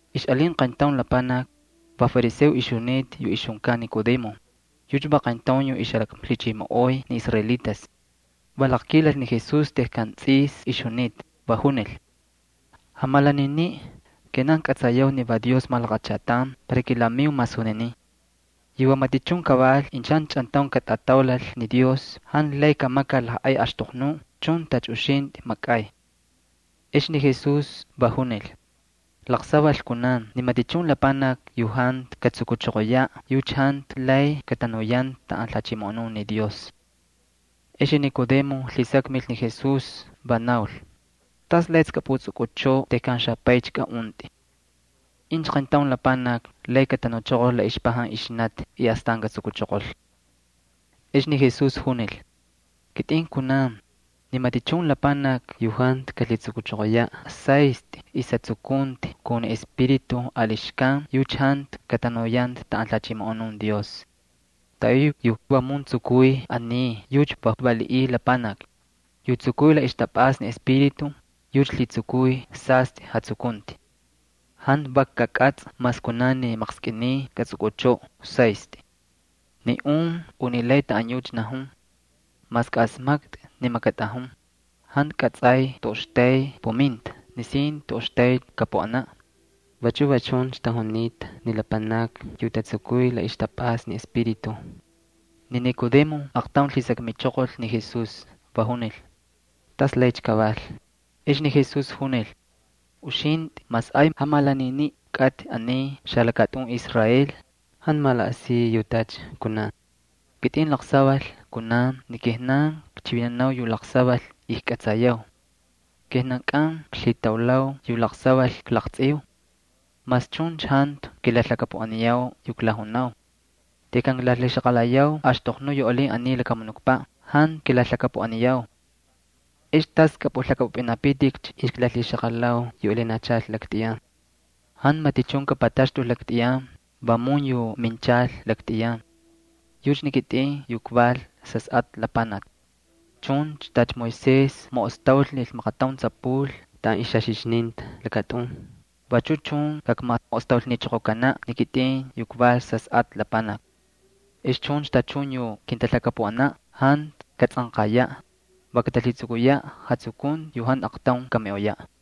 Ixꞌalin qayntaun lapanaki, va fariseo ixjunita yu ixjunkan Nicodemo, yucha va qayntaun yu ixjalaklhichimoꞌoy ni israelitas. Va laqkilal ni Jesús tejkan tsꞌis ixjunita, va junil: —Jamalaniniꞌ, kijnan kꞌatsayau ni va Dios malaqachatan para kilamiu masuninin. Yu va matichun kaval incha jantu chꞌantaun katꞌataulal ni Dios jantu lay kamakal lajꞌay axtoqnuꞌ chun tacha uxintꞌi makꞌay. Ex ni Jesús va junil: —Laqsaval kunan ni matichun lapanaki yu jantu katsukuchoqoyaꞌ, yucha jantu lay katanuyanta taꞌan lhachimoꞌonun ni Dios. Ex ni Nicodemo lhisakmil ni Jesús, va naul: —¿Tas laycha kꞌapꞌutsꞌukꞌuchꞌoꞌo tejkan xapaycha kaꞌuntꞌi? ¿Incha qayntaun lapanaki lay katanuchoqol la ixpajan ixnati y astan katsukuchoqol? Ex ni Jesús junil: —Kitꞌin kunan, ni matichun lapanaki yu jantu kalhitsukuchoqoyaꞌ saystꞌi ixjatsukunti kun ni Espíritu ali xkan yucha jantu katanuyanta taꞌan lhachimoꞌonun Dios. Taꞌayuꞌ yu vamun tsukuy aniy yucha va valiꞌiy lapanaki. Yu tsukuy la ixtapꞌasta ni Espíritu, yucha lhitsukuy sastꞌi jatsukunti. Jantu vak kakꞌatsꞌa mas kunan ni maqskꞌiniy katsꞌukꞌuchꞌoꞌo saystꞌi. Ni un unilay taꞌan yucha najun. Mas kꞌaꞌasmaktꞌi ni makatꞌajun, jantu kꞌatsꞌay toꞌoxtay puminta nisin toꞌoxtaycha kapuꞌanaꞌ. Vachu va chuncha tajunita ni lapanakni yu tatsukuy la ixtapꞌasta ni Espíritu. Ni Nicodemo aaqtaun lhisakmichoqol ni Jesús, va junil: —¿Tas laycha kaval? Ex ni Jesús junil: —Uxintꞌi mas ay jamalaniniꞌ kꞌatꞌi aniy xalakatꞌun Israel, ¿jantu malaꞌasiy yu tacha kunan? Kitꞌin laqsaval kunan ni kijnan klhichivinanau yu laqsaval ijkꞌatsayau. Kijnankꞌan klhitaulau yu laqsaval klaqtsꞌiu. Mas chuncha jantu kilalhakapuꞌaniyau yu klajunau. Tejkan klalhixaqalayau axtoqnu yu alin aniy lakamunukpaꞌ jantu kilalhakapuꞌaniyau. ¿Ex tas kꞌapꞌulhakꞌapꞌupꞌintꞌikcha incha kaklalhixaqalau yu alinachal laktꞌiyan? ’Jantu matichun kapataxtul laktꞌiyan, vamun yu minchal laktꞌiyan. Yucha ni kitꞌin yu kval Sasꞌatꞌa Lapanaki. Chuncha tacha Moisés maꞌostaulnil maqataun tsapul taꞌan ixjaxixninta lakatꞌun, vachu chun kakmaꞌostaulnichoqokanaꞌ ni kitꞌin yu kval Sasꞌatꞌa Lapanaki. Ex chuncha tachun yu kintalhakapuꞌanan jantu katatsꞌanqayaꞌ, va katalhitsukuyaꞌ jatsukunti yu jantu aqtaun kamiꞌoyaꞌ.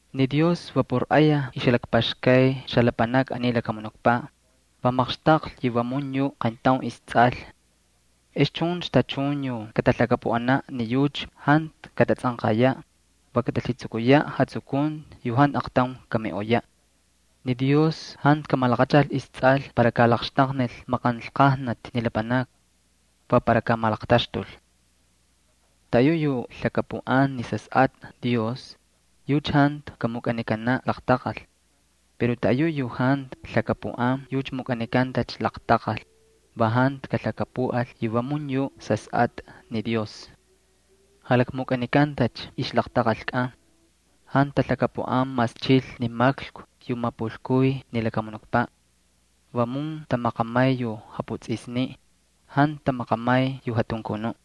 ’Ni Dios va por ayaj ixjalakpaxkay xalapanakni aniy lakamunukpaꞌ, va maqxtaqlhi yu vamun yuꞌ istsꞌal. Ex chuncha tachun yu katalhakapuꞌanaꞌ ni yucha jantu katatsꞌanqayaꞌ, va katalhitsukuyaꞌ jatsukunti yu jantu aqtaun kamiꞌoyaꞌ. Ni Dios jantu kamalaqachal istsꞌal para kalaqxtaqnil maqanlqajnati ni lapanakni. Va para kaamalaqtaxtul. ’Taꞌayuꞌ yu lhakapuꞌan ni Sasꞌatꞌa Dios, yucha jantu kamukꞌanikanaꞌ laqtaqal. Pero taꞌayu yu jantu lhakapuꞌan, yucha mukꞌanikantacha laqtaqal, va jantu kalhakapuꞌal yu vamun yuꞌ Sasꞌatꞌa Dios. Jalakmukꞌanikantacha ixlaqtaqalkꞌan. Jantu talhakapuꞌan mas chil ni maklku yu mapulkuy ni lakamunukpaꞌ. Vamun tamaqamay yu japutsꞌisniꞌ, jantu tamaqamay yu jatunkunuꞌ.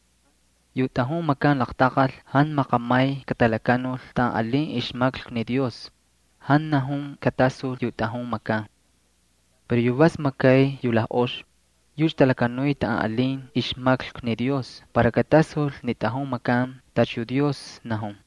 Yu tꞌajun makan laqtaqal jantu maqamay katalakanul taꞌan alin ixmaklku ni Dios, jantu najun katasul yu tꞌajun makan. Pero yu vas makay yu lajꞌox, yucha talakanuy taꞌan alin ixmaklku ni Dios para katasul ni tꞌajun makan tacha yu Dios najun.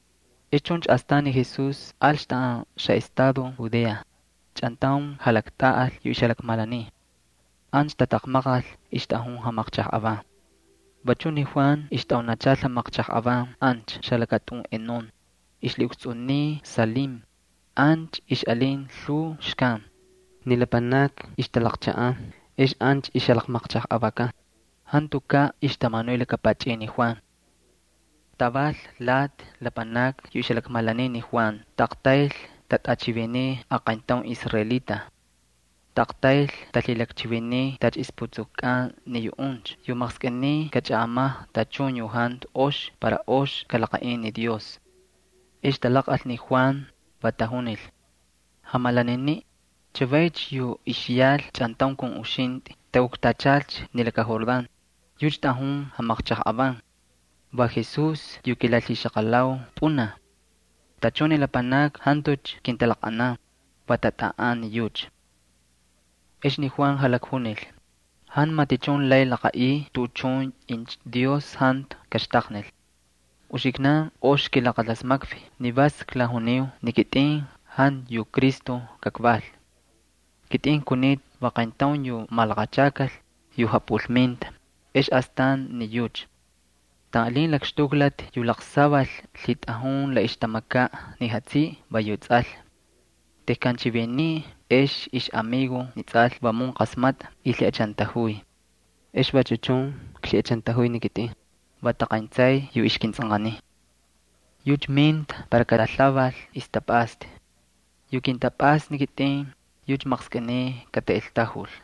Ex chuncha astan ni Jesús alcha taꞌan xaꞌestado Judea, chꞌantaun jalaktꞌaꞌal yu ixjalakmalaniy. Ancha tataqmaqal, ixtꞌajun jamaqchajꞌavan. Vachu ni Juan ixtꞌaunachal jamaqchajꞌavan ancha xalakatꞌun Enón, ixlhiꞌukstsꞌuniy Salim, ancha ixꞌalin lhuu xkan. Ni lapanakni ixtalaqchaꞌan, ex ancha ixjalaqmaqchajꞌavakan. Jantukaꞌ ixtamanuy laka pachꞌin ni Juan. Taval lati lapanakni yu ixjalakmalaniy ni Juan taꞌaqtayl tatꞌachiviniy aqayntaun israelita. Taꞌaqtayl talhilakchiviniy tacha ixputsukukꞌan ni yuꞌuncha yu maqskꞌiniy kachꞌaꞌamajꞌa tachun yu jantu ox para ox kalaqaꞌin ni Dios. Ex talaqꞌal ni Juan, va tajunil: —Jamalaniniꞌ, chavaycha yu ixyal chꞌantaun kun uxintꞌi takuktachal ni laka Jordán, yucha tꞌajun jamaqchajꞌavan. Va Jesús yu kilalhixaqalau pꞌunaj. Tachun ni lapanakni jantucha kintalaqꞌanan, va tatꞌaꞌan ni yucha. Ex ni Juan jalakjunil: —Jantu matichun lay laqaꞌiy tuꞌuchun incha Dios jantu kaxtaqnil. Uxiknan ox kilaqalasmakvi ni vas klajuniu ni kitꞌin jantu yu Cristo kakval. Kitꞌin kunita va qayntaun yu malaqachakal, yu japꞌulminta, ex astan ni yucha. Taꞌan alin lakxtuklati yu laqsaval lhitꞌajun la ixtamakaꞌ ni jatsiꞌi va yu tsꞌal. Tejkan chiviniy ex ixꞌamigo ni tsꞌal vamun qasmatꞌa y lhiꞌachantajuy. Ex vachu chun klhiꞌachantajuy ni kitꞌin, va taqayntsay yu ixkintsꞌanqaniy. Yucha minta para kalalhaval ixtapꞌasta. Yu kintapꞌasta ni kitꞌin, yucha maqskꞌiniy kataꞌeltajul.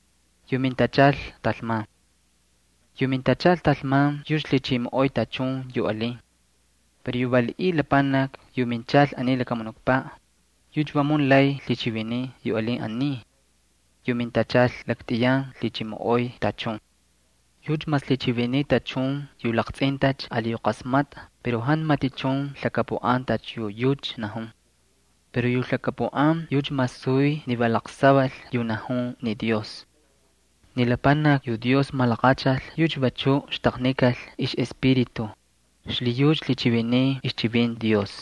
Yu mintachal talman yucha lhichimoꞌoy tachun yu alin. Pero yu valiꞌiy lapanaki yu minchal aniy lakamunukpaꞌ, yucha vamun lay lhichiviniy yu alin aniy. Yu mintachal laktꞌiyan lhichimoꞌoy tachun. Yucha mas lhichiviniy tachun yu laqtsꞌintacha ali yu qasmakta pero jantu matichun lhakapuꞌan tacha yu yucha najun. Pero yu lhakapuꞌan yucha masuy ni va laqsaval yu najun ni Dios. Ni lapanaki yu Dios malaqachal yucha vachuꞌ xtaqnikal ixꞌEspíritu, xlhiyucha lhichiviniy ixchivinti Dios.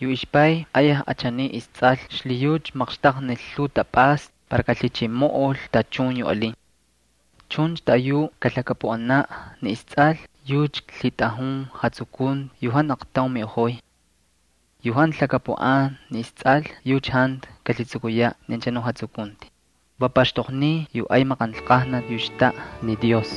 Yu ixPay ayaj achaniy isTsꞌal xlhiyucha yucha maqxtaqnil lhuu tapꞌasta para kalhichimoꞌol tachun yu alin. Chuncha taꞌayuꞌ yu kalhakapuꞌanaꞌ ni isTsꞌal yucha lhitꞌajun jatsukunti yu jantu aqtaun kamiꞌoyaꞌ. Yu jantu lhakapuꞌan ni isTsꞌal yucha jantu kalhitsukuyaꞌ ni anchanuꞌ jatsukunti, va paxtoqniy yu ay maqanlqajnati yu xtaꞌa ni Dios.